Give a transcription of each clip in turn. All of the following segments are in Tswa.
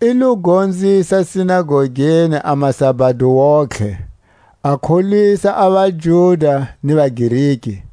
I lo gonzisa sinagogeni a masabado wontihe, a kholwisa a vaJuda ni vaGreki.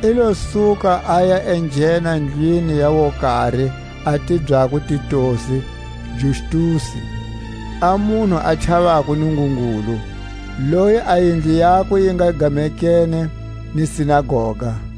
I lo suka, a ya enghena ndlwini ya wokari a tibyako Titusi Justusi, a munhu a chavako Nungungulu, loyi a yindlu yakwe yi nga gamekene ni sinagoga.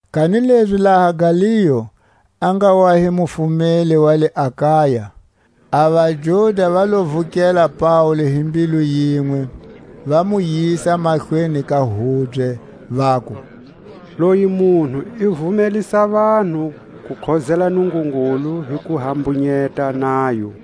Kanilezi laha Galio a nga wa hi mufumeli wa le Akaya, a vaJuda va lo vukela Paule hi mbilu yinwe, va mu yisa mahlweni ka hubye, vaku: Loyi munhu i vumelisa vanhu ku khozela Nungungulu hi ku hambunyeta nayo.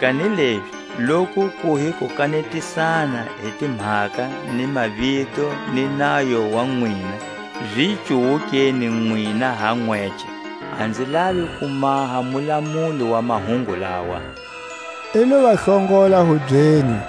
kanilezi loku ku hi kukanetisana hi timhaka ni mavito ni nayo wa nwina, zi cuwukeni nwina ha nwece; a nzi lavi ku maha mulamuli wa mahungu lawa. I lo va hlongola hubyeni.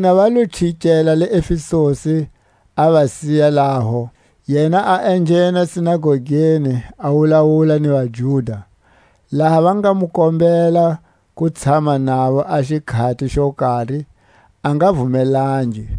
Vona va lo chikela Efesusi, a va siya laho; yena a enghena sinagogeni a wulawula ni vaJuda. Laha va nga mu kombela ku tshama navo a xikhati xo kari, a nga vumelangi;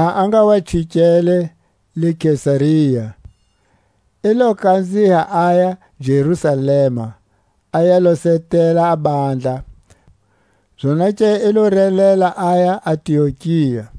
Laha a nga wa chikele le Kesaria, i lo kanziha aya Jerusalema a ya losetela bandla, zonake i lo relela aya Antiokia.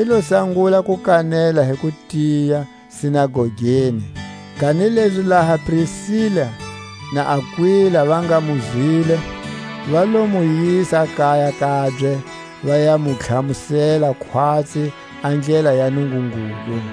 I lo sangula ku kanela hi kutiya sinagogeni. Kanilezi laha Prisila na Akwila va nga mu zwile, va lo mu yisa kaya kabye, va ya mu tlhamusela khwatsi a ndlela ya Nungungulu.